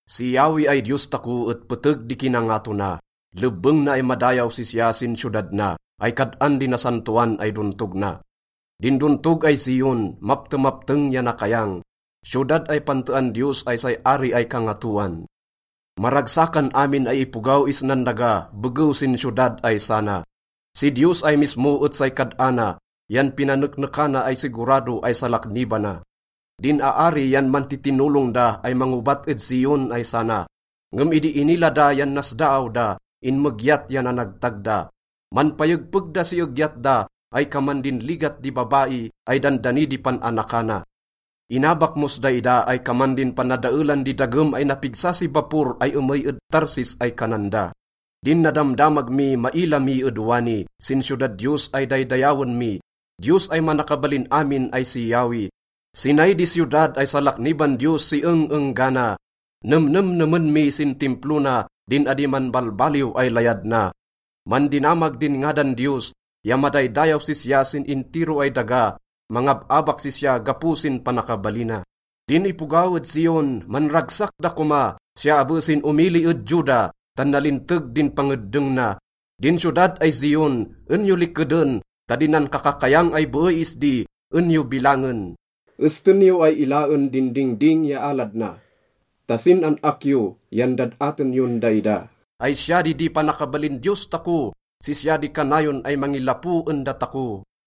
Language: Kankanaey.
Si Yahweh ay Diyos tako et peteg di kinangato na, lebbeng na ay madayaw sisya sin siyodad na ay kad-an di nasantoan ay dontog na. Din dontog ay Zion, maptemapteng ya nakayang, siyodad ay pantean Diyos ay say Ari ay Kangatoan. Maragsakan amin ay ipogaw isnan daga begew sin siyodad ay sana. Si Diyos ay mismo et say kad-ana, yan pinaneknekana ay sigurado ay salaknibana. Din aari yan mantitinolong da ay mangobat ed Zion ay sana. Ngem idi inila da yan nasdaaw da, inmegyat ya nanagtag da. Manpayegpeg da si egyat da ay kaman din ligat di babai ay dandani di pan-anakana. Inabak mos daida ay kaman din panadaelan di dagem ay napigsa si bapor ay emey ed Tarsis ay kanan da. Din nadamdamag mi, maila mi ed wani sin siyodad Diyos ay daydayawen mi, Diyos ay Manakabalin Amin ay si Yahweh. Sinay di siyodad ay salakniban Diyos si eng-enggana. Nemnemnemen mi sin Timplo na din adi manbalbaliw ay layad na. Mandinamag din ngadan Diyos ya madaydayaw sisya sin intiro ay daga. Mangab-abak sisya gapo sin panakabalina. Din ipogaw ed Zion, manragsak da koma, siya abe sin omili ed Juda, tan nalinteg din pangeddeng na. Din siyodad ay Zion, en yo likeden ta din nankakakayang ay beey isdi, en yo bilangen. Esten yo ay ilaen din dingding ya alad na ta sin an-ak yo yan dad-aten yon daida ay siya di di panakabalin Diyos tako, sisya di kanayon ay mangilapo en datako.